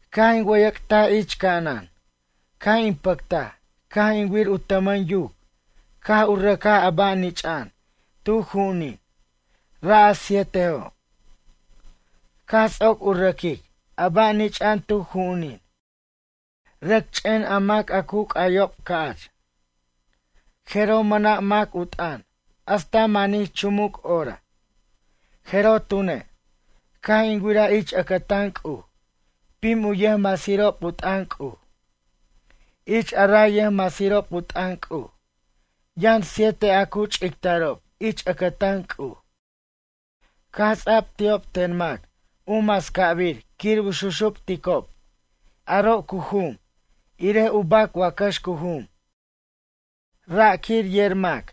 Caj in wʌyʌc'taj ich ca'anan caj in pʌctaj caj in wir u tʌmʌn yuc caj u rʌcaj a ba' nich'a'an tu ju'unin, ra' a sietejo'. Caj ts'oc u rʌquic a ba' nich'a'an tu ju'unin, rʌc ch'en a mac a cu c'ayob ca'ch. Jeroj mʌna' mac u t'ʌn hasta manij chumuc hora. Jeroj tune', caj in wiraj ich ʌcʌtan C'uj pim u yʌjmasirob u t'ʌn C'uj. Ich a ray yʌjmasirob u t'ʌn C'uj, yʌn siete a cu ch'ictarob ich ʌcʌtan C'uj. Caj ts'a'b ti'ob ten mac u mascabir quir u xuxupticob, aro' cu jum irej u bac wacax cu jum, ra' quir yer mac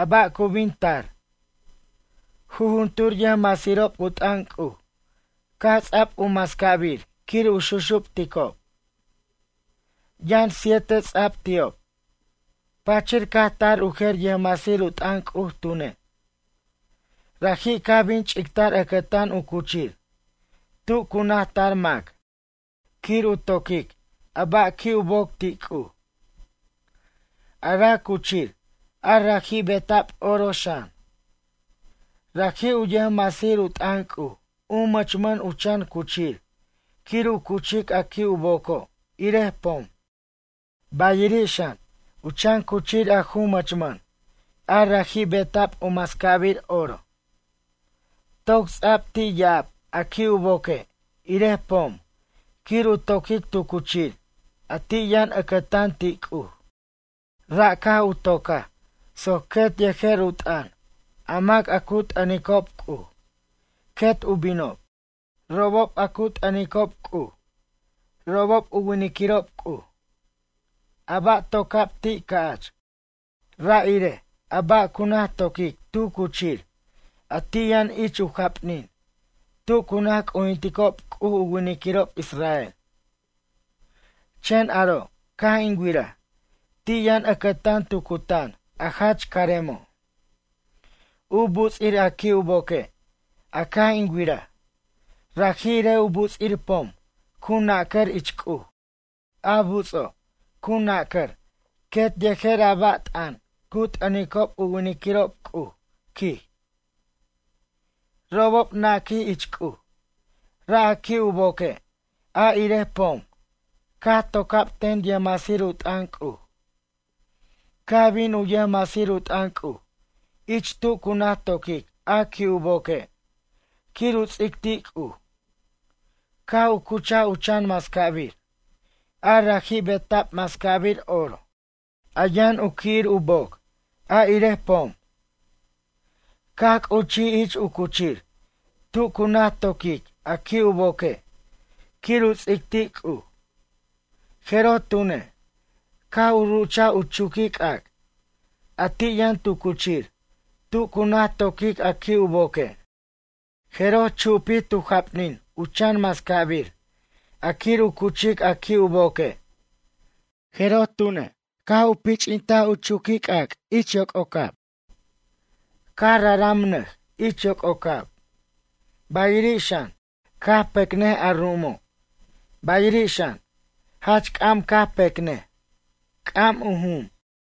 a ba' cu bin tar. Jujuntur yʌjmasirob u t'ʌn C'uj caj ts'a'b u macabir quir u xuxupticob. Yʌn siete ts'a'b ti'ob. Pachir caj tar u jer yʌjmasir u t'ʌn C'uj tune'. Raji' caj bin ch'ictar ʌcʌtan u cuchir tu cu naj tar mac quir u toquic a ba' qui' u boc ti' C'uj. A ra' cuchir a raji' beta'b oro xan. Raji', u yʌjmasir u t'ʌn C'uj u mʌchmʌn u chan cuchir quir u cuchic a qui' u boco' irej pom. Bayiri' xan, u chan cuchir a ju mʌchmʌn a raji' beta'b u mascabir oro. Toc ts'a'b ti' ya'ab a qui' u boque' irej pom quir u toquic tu cuchir a ti' yʌn ʌcʌtan ti' C'uj. Ra' caj u tocaj soc quet yejer u t'ʌn a mac a cu t'ʌnicob C'uj quet u binob. Robob a cu t'ʌnicob C'uj, robob u winiquirob C'uj. A ba' toca'b ti' ca'ch, ra' irej a ba' cu naj toquic tu cuchir a ti' yʌn ich u japnin, tu cu naj c'ujinticob C'uj u winiquirob israel. Chen aro' caj in wiraj, ti' yʌn ʌcʌtan tu cutan, a jach caremo'. U buts'ir a qui' u boque', a caj in wiraj, ra' irej u buts'ir pom cu nacʌr ich C'uj, a buts'o', cu nacʌr quet yejer a ba' t'ʌn cu t'ʌnicob u winiquirob C'uj, quij. Robob naquij ich C'uj. Ra' a qui' u boque' a irej pom caj toca'b ten yʌjmasir u t'ʌn C'uj. Caj bin u yʌjmasir u t'ʌn C'uj ich tu cu naj toquic a qui' u boque' quir u ts'ic ti' C'uj. Caj u cuchaj u chan mascabir, a raji' beta'b mascabir oro, a yʌn u qui'ir u boc a irej pom. Caj c'uchij ich u cuchir tu cu naj toquic a qui' u boque' quir u ts'ic ti' C'uj, jeroj tunej, caj u ruchaj u chuquic'ac' a ti' yʌn tu cuchir tu cu naj toquic a qui' u boque'. Jeroj chupij tu japnin u chan mascabir a quir u cuchic a qui' u boque', jeroj tune' caj u pich'int u chuquic'ac' ich yoc'ocab, caj raramnʌj ich yoc'ocab, bayiri' xan, caj pecnʌj a ru'umo', bayiri' xan, jach c'am pecnʌj, c'am u jum.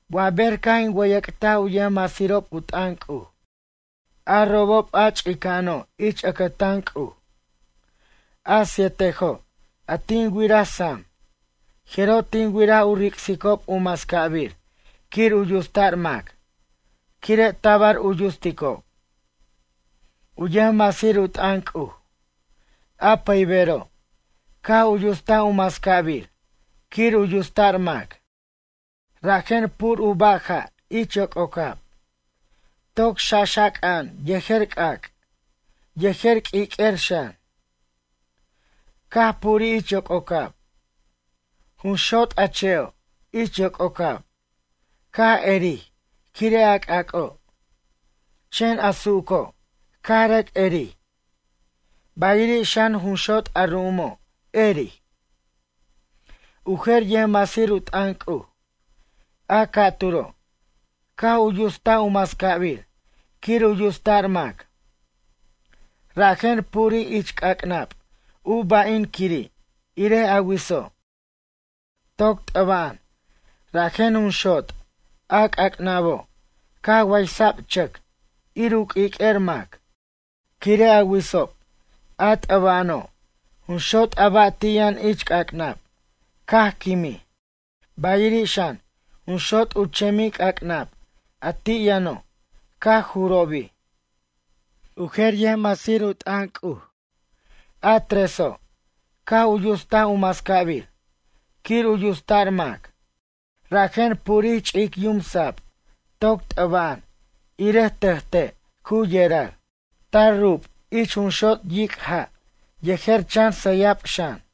Wa ber caj in wʌyʌc'taj u yʌjmasirob u t'ʌn C'uj, a robob a ch'ica'ano' ich ʌcʌtan C'uj. A sietejo', a tin wiraj sam. Jeroj tin wiraj u ric'sicob u mascabir quir u yutsta'r mac, quire' tabar u yutsicob. U yʌjmasir u t'ʌn C'uj, a pʌybero', caj u yutstaj u mascabir quir u yutsta'r mac. Rajen pur u baja' ich yoc'ocab, toc xaxaca'an yejer c'ac', yejer q'uiq'uer xan, caj purij ich yoc'ocab. Jun xot' a che'o' ich yoc'ocab, caj erij quire' a c'ac'o'. Chen a su'uco', caj rʌc erij, bayiri' xan jun xot' a ru'umo', erij. U jer yʌjmasir u t'ʌn C'uj, a ca'turo' caj u yutst u mascabir quir u yutsta'r mac. Rajen purij ich c'ac'nab u ba'in quiri' irej a witso', toc t'ʌba'an, rajen jun xot' a c'ac'nabo' caj waysa'b chʌc, ir u q'uiq'uer mac. Quire' a witsob, a t'ʌba'ano', jun xot' a ba' ti' yʌn ich c'ac'nab caj quimij. Bayiri' xan, jun xot' u chemic'ac'nab a ti' yʌno', caj jurobij. U jer yʌjmasir u t'ʌn C'uj, a treso', caj u yutstaj u mascabir quir u yutsta'r mac. Rajen purbij ch'ic yum sab toc t'ʌba'an, irej tʌjte' cu yerar. Tar rub ich jun xot' yic' ja' yejer chan sʌyab xan.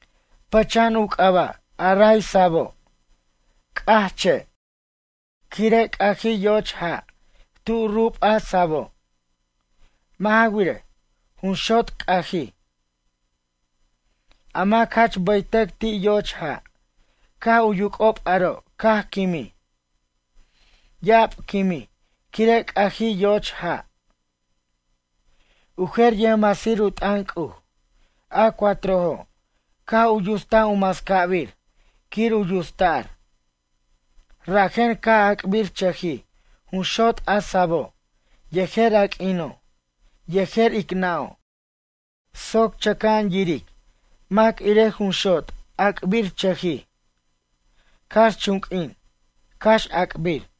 Pʌcha'an u c'aba' a ray sabo', C'aj che', quire' c'ajij yo'och ja' tu rub a sabo'. Mʌ' ja wirej, jun xot' c'ajij. A mac jach bʌytʌc ti' yo'och ja', caj u yuc'ob aro' caj quimij. Ya'ab quimij quire' c'ajij yo'och ja'. U jer yʌjmasir u t'ʌn C'uj, a cuatrojo', caj u yutst u mascabir quir u yutsta'r. Rajen caj ac'birchʌjij jun xot' a sabo' yejer a q'uino', yejer ic nʌ'o' soc chen chʌca'an yiric mac irej jun xot' ac'birchʌjij, cax chun q'uin cax ac'bir.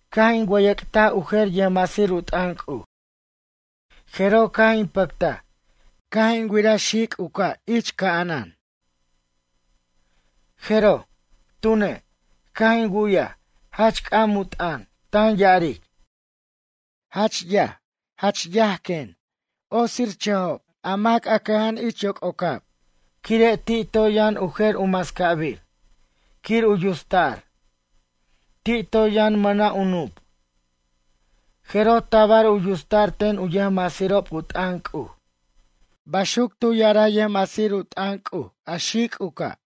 Caj in wʌyʌc'taj u jer yʌjmasir u t'ʌn C'uj, jeroj caj in pʌctaj caj in wiraj xic' u ca' ich ca'anan. Jeroj, tune', caj in wu'yaj jach c'am u t'ʌn tan ya'aric: ―Ay, quen, jach ay quen, otsirchʌjob a mac a cʌja'an ich yoc'ocab quire' ti' toy yʌn u jer u mascabir quir u yutsta'r. Ti' toy yʌn mʌna' u nup'. Jeroj tabar u yutsta'r ten u yʌjmasirob u t'ʌn C'uj. Baxuc tu ya'araj yʌjmasir u t'ʌn C'uj a xic' u ca'.